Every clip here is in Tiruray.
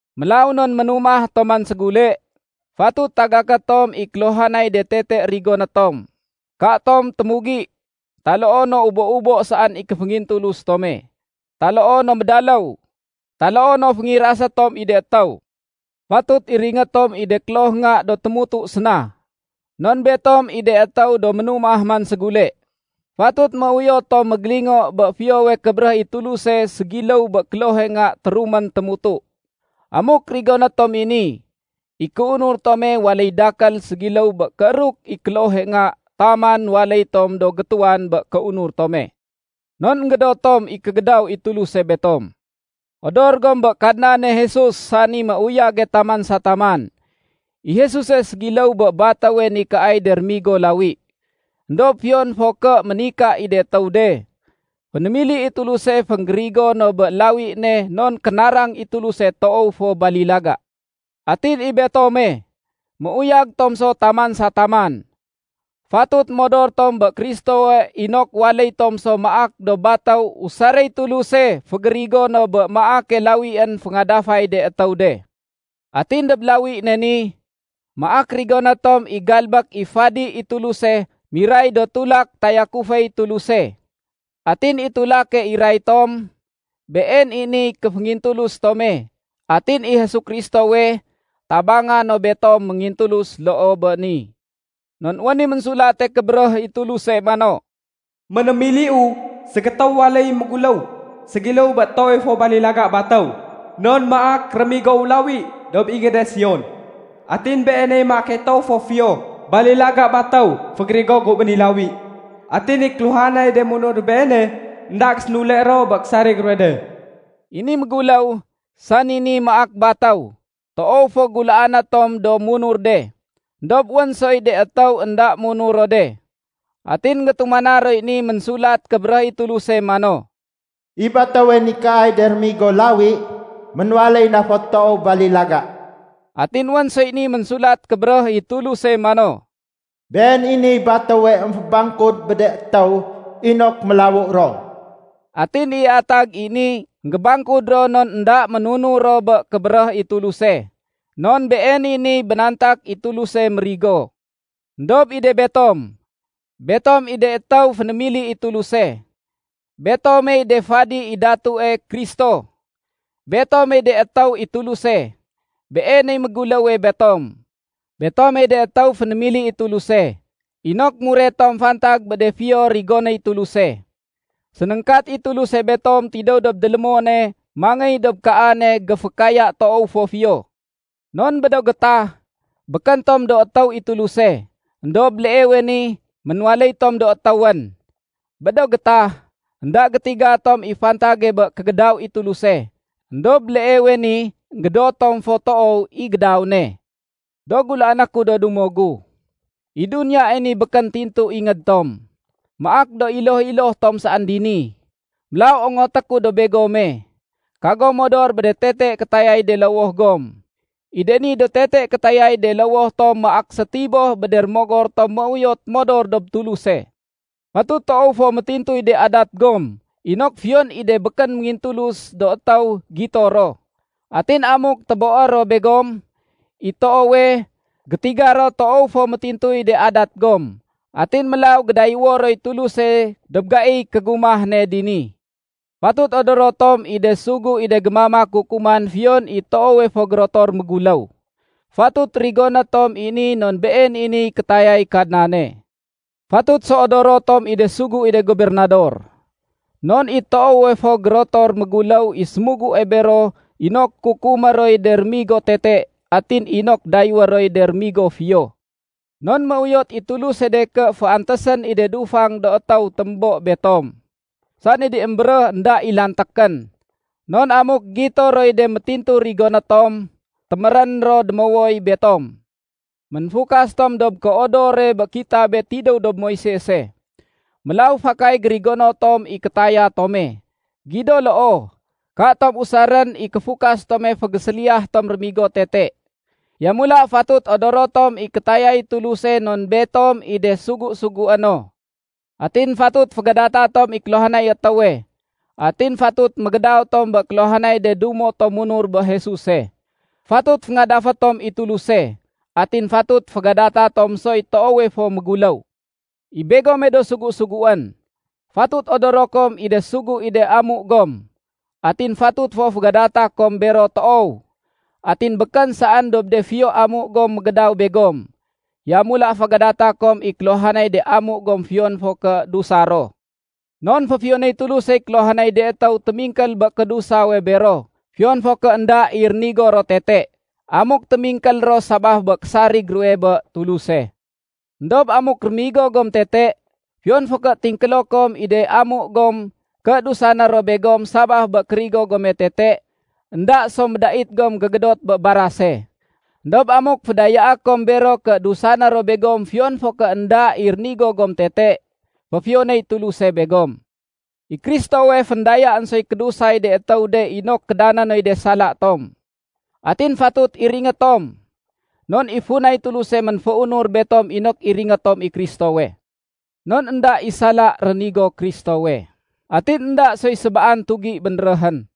Mélaw non ménumah tom man ségule, fatut tagaké tom i kéluhanay de tete rigoné tom. Katom témugi taloo no ubo-ubo saén i kéféngintulus tome, taloo no médaléw, taloo no féngirasé tom i de étéw. Fatut iringé tom i de kloh nga do témutu séna, non betom i de étéw do ménumah man ségule. Fatut méuyot tom mégélingo bé fiyowe kébéréh i Tuluse ségiléw bé klohe nga térumén témutu. Amuk rigoné tom i ni, i kéunur tome waléy dakél ségiléw bé kééruk i klohe nga taman waléy tom do gétuwan bé kéunur tome. Non énggédot tom i kégédaw i Tuluse betom. Odor gom bé Kadnane Jesus sani méuyage taman sa taman. I Jesuse ségiléw bé batéwe nikaay de rémigo lawi. Endob fiyon fo ké ménika i de étéw de, fénémili i Tuluse fénggérigo no bé lawi ne non kénarang i Tuluse toow fo balilaga. Atin i betome, méuyag tom so taman sa taman. Fatut modor tom bé Kristowe inok waléy tom so maak do batéw usaréy Tuluse fégérigo no bé maake lawién féngadafay de étéw de. Atin dob lawi ne ni, maak rigoné tom i galbék i fadi i Tuluse miray do tulak tayakuféy Tuluse. Atin i tulake iray tom, been i niy kéféngintulus tome. Atin i Jesu Kristowe, tabanga no betom méngintulus loo bé ni. Non wén i Ménsulate Kébéréh i Tuluse mano, “Ménémiliu ségétéw waléy méguléw ségiléw bé toowe fo balilaga batéw. Non maak rémigowu lawi dob ingéde Sion, atin Beeney maake toow fo fiyo balilaga batéw fégérigo gu bé ni lawi. Atin i kéluhanay de munur dob Beene, énda gésénule ro bé késarig ruwe de.” I ni méguléw, sani ni maak batéw, toow fo gulaané tom do munur de. Endob wén soy de étéw énda munur ro de. Atin énggétumana roy ni Ménsulat Kébéréh i Tuluse mano, “I batéwe nikaay de rémigo lawi, ménwaléy na fo toow balilaga.” Atin wén soy ni Ménsulat Kébéréh i Tuluse mano, “Been i niy batéwe émfébangkud bé de étéw inok mélawu ro.” Atin i atag i ni, énggébangkud ro non énda ménunur ro bé kébéréh i Tuluse, non been i niy bénantak i Tuluse mérigo. Endob i de betom, betom i de étéw fénémili i Tuluse. Betomey de fadi i Datue Kristo. Betomey de étéw i Tuluse. Been i méguléwe betom. Betomey de étéw fénémili i Tuluse inok muret tom fantag bé de fiyo rigonéy Tuluse. Sénéngkat i Tuluse betom tidéw dob délémone mangéy dob kaane géfékaya toow fo fiyo. Non bé do gétah, békén tom do étéw i Tuluse, éndob béleewe ni ménwaléy tom do étéwén. Bé do gétah, énda gétiga tom i fantage bé kégédaw i Tuluse, éndob béleewe ni énggédot tom fo toow i gédaw ne. Do gulaané ku do dumo gu, i duniyae ni békén tintu ingéd tom. Maak do iloh-iloh tom saén dini. Mélaw ongoté ku dob begome, kagom modor bé de tete kétayay de lowoh gom. I de ni do tete kétayay de lowoh tom maak sétiboh bé de rémogor tom méuyot modor dob Tuluse. Fatut toow fo métintuy de adat gom inok fiyon i de békén méngintulus do étéw gito ro. Atin amuk téboé ro begom, i toowe, gétiga ro toow fo métintuy de adat gom. Atin mélaw gédayéwo roy Tuluse dob gaiy kégumah ne dini. Fatut odoro tom i de sugu i de gémamak kukuman fiyon i toowe fo gérotor méguléw. Fatut rigoné tom i ni non been i niy kétayay Kadnane. Fatut so odoro tom i de sugu i de gobernador. Non i toowe fo gérotor méguléw i sémugue bero inok kukumé roy de rémigo tete atin inok dayéwé roy de rémigo fiyo. Non méuyot i Tuluse de ké féantésén i de dufang do étéw témbo betom, sani de émbéréh énda i lantékén. Non amuk gito roy de métintu rigoné tom, témérén ro démowoy betom. Ménfukas tom dob kéodore bé kitabe tidéw dob Moisese. Mélaw fakay gérigono tom i kétaya tome. Gido loo, katom usarén i kéfukas tome fégéséliyah tom rémigo tete. Yamula fatut odoro tom i kétayay Tuluse non betom i de sugu-sugué no. Atin fatut fégadata tom i kéluhanay étéwe. Atin fatut mégédaw tom bé kéluhanay de dumo tom munur bé Jesuse. Fatut féngadafé tom i Tuluse. Atin fatut fégadata tom soy toowe fo méguléw. I begome do sugu-suguén, fatut odoro kom i de sugu i de amu gom, atin fatut fo fégadata kom bero toow. Atin békén saén dob de fiyo amu gom mégédaw begom. Yamula fégadata kom i kéluhanay de amu gom, fiyon fo ké dusa ro. Non féfiyonéy Tulusey kéluhanay de étéw témingkél bé kédusawe bero fiyon fo ké énda i rénigo ro tete, amuk témingkél ro sabaf bé késarig ruwe bé Tuluse. Endob amuk rémigo gom tete, fiyon fo ké tingkélo kom i de amu gom ké dusané ro begom sabaf bé kérigo gome tete, énda so médait gom gégédot bé barase. Endob amuk fédayaé kom bero ké dusané ro begom fiyon fo ké énda i rénigo gom tete, féfiyonéy Tuluse begom. I Kristowe féndayaén soy kédusay de étéw de inok kédané noy de sala tom. Atin fatut iringé tom. Non i funay Tuluse ménféunur betom inok iringé tom i Kristowe. Non énda i sala rénigo Kristowe, atin énda soy sébaan tugi bénréhén.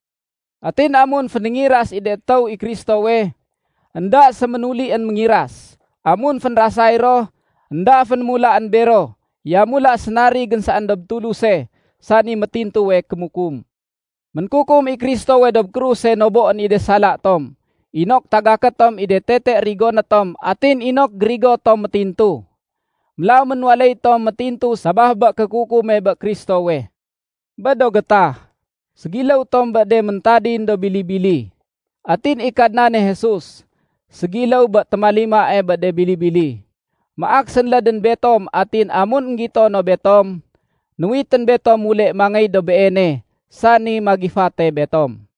Atin amun fénéngiras i de étéw i Kristowe, énda séménulién méngiras. Amun fénrasay ro, énda fénémulaén bero. Yamula sénarigén saén dob Tuluse, sani métintuwe kémukum. Ménkukum i Kristowe dob kruse noboén i de sala tom, inok tagaké tom i de tete rigoné tom atin inok gérigo tom métintu. Mélaw ménwaléy tom métintu sabaf bé kékukume bé Kristowe. Bé do gétah, ségiléw tom bé de méntadin do bili-bili. Atin i Kadnane Jesus, ségiléw bé témalimae bé de bili-bili. Maak sénlédén betom atin amun énggito no betom, nuwitén betom mule mangéy dob Beene, sani magifate betom.